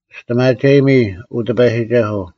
ᒋᔅᑎᒪᒐᔨᒥ, ᐅ ᑎᐸᔨᒋᒐᓱᐤ;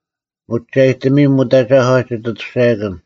ᒧᒐᔨᑎᒥᔨᒻ ᐅᑦ ᐊᒐᒂ ᒋᑦ ᐊᑐᔅᒐᔭᑭᓐ;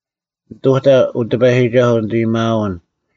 ᓂᑐᑕ, ᐅ ᑎᐸᔨᒋᒐᓱᐤ, ᓂᑦ ᐊᔭᒥᐊᐅᓐ;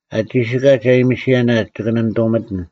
ᐊ ᒋᓯᑲᒡ ᐊᔨᒥᓯᔭᓇ ᒋᑭ ᓇᓂᑐᒥᑎᓐ;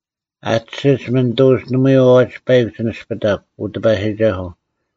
ᐊ ᑕᓯᒡ ᒥᓂᑐᐅᒡ ᓇᒪᐎᔾ ᐛᐛᒡ ᐸᐃᒄ ᒋ ᓂᔅᐱᑕᒄ, ᐅ ᑎᐸᔨᒋᒐᓱᐤ;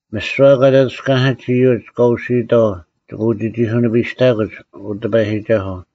ᒥᓯᐛ ᑲ ᑕᑐᔅᑲᓇᓯᒡ ᐃᔪᒡ ᑲ ᐅᓯᐊᑥᐤ ᒋᑭ ᐅᒋᒋᑯᓂᐱᔅᑕᑯᒡ, ᐅ ᑎᐸᔨᒋᒐᓱᐤ;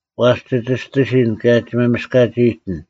ᐛᔅ ᒋ ᒋᔅᑎᓯᓐ, ᑭᔭ ᒋ ᒪᒥᔅᑲᒡ ᐊᐃᑎᓐ: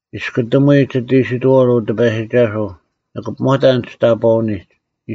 ᒋᔅᑯᑎᒧᐎ ᒋᑦ ᐃᓯᑥᐅᓐ, ᐅ ᑎᐸᔨᒋᒐᓱᐤ; ᓂᑭ ᐱᒧᑕᓐ ᒋᑕᑈᐅᓂᒡ: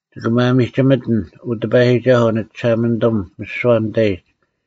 ᒋᑭ ᒪᒥᒋᒥᑎᓐ, ᐅ ᑎᐸᔨᒋᒐᓱᐤ, ᓂᒋᓴᒪᓂᑐᒻ, ᒥᓯᐛ ᓂᑕᐃᒡ: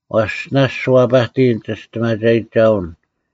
ᐛᔅ ᓇᔅᒡ ᒋ ᐛᐸᑎᔨᓐ ᒋᒋᔅᑎᒪᒐᔨᒋᒐᐅᓐ;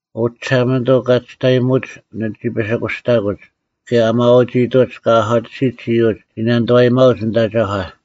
ᐅ ᒋᓴᒪᓂᑐᐤ, ᑲ ᒋᔅᑕᔨᒧᒡ ᓂᒋ ᐱᓯᑯᔅᑕᑯᒡ, ᑭᔭ ᐊ ᒪᐛᒋᐃᑐᒡ ᑲ ᐊᒂᑎᓯᒡ ᐃᔪᒡ ᒋ ᓇᓂᑐᐛᔨᒪᐅᒡ ᓂᑦ ᐊᒐᒂ;